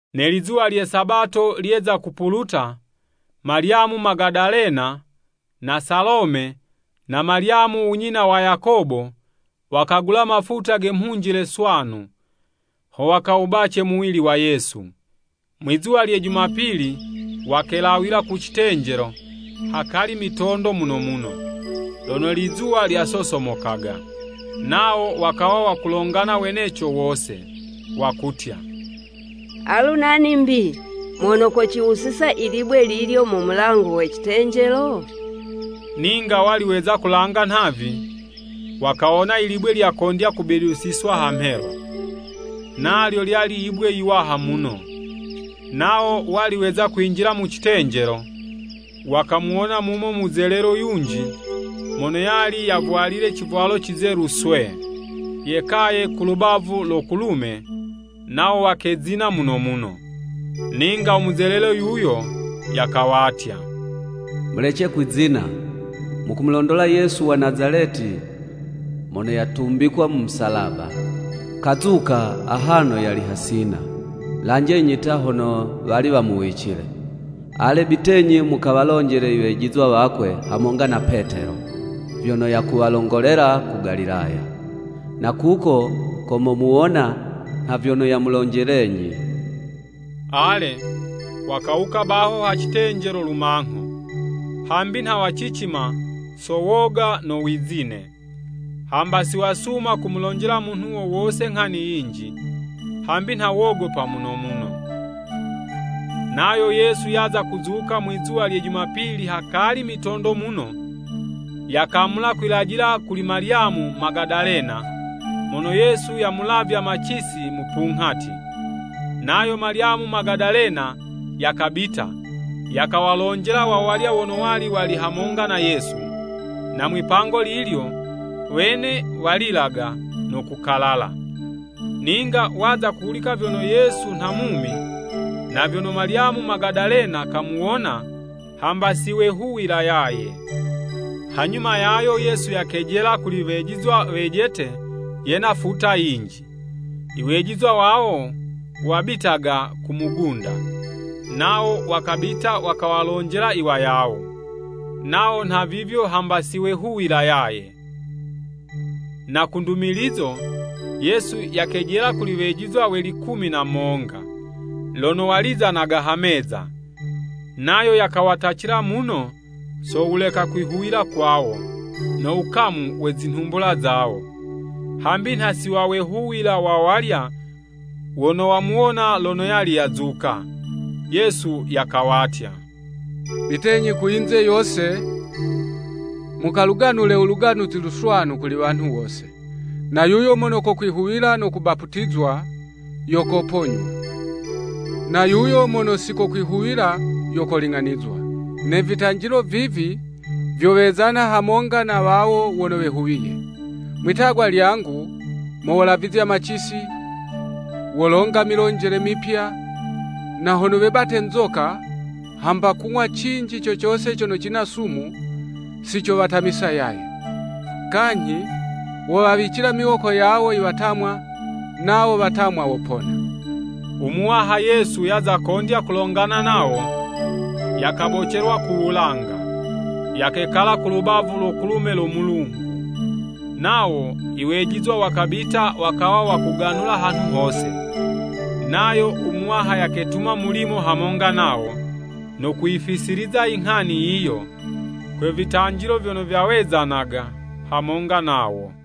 Ne lizuwa lye Sabato lyeza kupuluta, Malyamu Magadalena, na Salome na Malyamu unyina wa Yakobo, wakagula mafuta ge mhunjile swanu, ho wakawubace muwili wa Yesu. Mwi'zuwa lye Jumapili wakelawila ku citenjelo hakali mitondo muno muno, lono lizuwa lyasosomokaga. Nawo wakawa wakulongana weneco wose, wakutya, “Alu nani 'mbi mono kociwusiza i libwe lilyo mu mulango we citenjelo?” Ninga wali weza kulanga nhavi, wakawona i libwe lyakondya kubidusizwa ha mhelo (Nalyo lyali yibwe yiwaha muno.) Nawo wali weza kwinjila mu citenjelo, wakamuwona mumo muzelelo yunji mono yali yavwalile civwalo cizelu swee, yekaye ku lubavu lo kulume, nawo wakezina muno muno. Ninga u muzelelo yuyo yakawatya, “Mulece kwizina. Mukumulondola Yesu wa Nazaleti mono yatumbikwa mu musalaba. Kazuka, ahano yali hasina. Lanjenyi ta, hono wali wamuwicile. Ale bitenyi mukawalonjele i wejizwa wakwe hamonga na Petelo, vyono yakuwalongolela ku Galilaya. Na kuko ko momuwona nha vyono yamulonjelenyi.” Ale, wakawuka baho ha citenjelo lumangho, hambi nha wacicima so woga no wizine. Hamba si wasuma kumulonjela munhu wo wose nghani yinji, hambi nha wogopa muno muno. [ Nayo Yesu yaza kuzuka mwizuwa lye Jumapili hakali mitondo muno, yakamula kwilajila kuli Malyamu Magadalena, mono Yesu yamulavya macisi mupunghati. Nayo Malyamu Magadalena yakabita, yakawalonjela wawalya wono wali wali hamonga na Yesu, na mwipango lilyo, wene walilaga no kukalala. Ninga waza kuhulika vyono Yesu nha mumi, na vyono Malyamu Magadalena kamuwona, hamba siwehuwila yaye. Hanyuma yayo Yesu yakejela kuli wejizwa wejete yena futa yinji. Iwejizwa wawo wabitaga ku mugunda. Nawo wakabita wakawalonjela iwayawo. Nawo nhavivyo hamba siwehuwila yaye. Na ku ndumilizo, Yesu yakejela kuli wejizwa we likumi na monga, lono walizanaga ha meza. Nayo yakawatacila muno so wuleka kwihuwila kwawo, no wukamu we zinhumbula zawo, hambi nha siwawehuwila wawalya wono wamuwona lono yali yazuka. Yesu yakawatya, “Bitenyi ku yinze yose, mukaluganule u Luganuzi Luswanu kuli wanhu wose. Na yuyo mono kokwihuwila no kubaputizwa yo koponywa. Na yuyo mono si kokwihuwila yo kololing'anizwa. Ne vitanjilo vivi, vyowezana hamonga na wawo wono wehuwiye: mwi'tagwa lyangu mo wolavizya macisi, wolonga milonjele mipya. Na hono webate nzoka, hamba kung'wa cinji co cose cono cina sumu, sicowatamisa yaye.” Kanyhi wowawicila miwoko yawo i watamwa, nawo watamwa wopona. U Muwaha Yesu yaza kondya kulongana nawo, yakabocelwa ku wulanga, yakekala ku lubavu lo kulume lo Mulungu. Nawo iwejizwa wakabita wakawa wakuganula hanhu hose. Nayo u Muwaha yaketuma mulimo hamonga nawo, no kuyifisiliza inghani yiyo, kwe vitanjilo vyono vyawezanaga hamonga nawo.]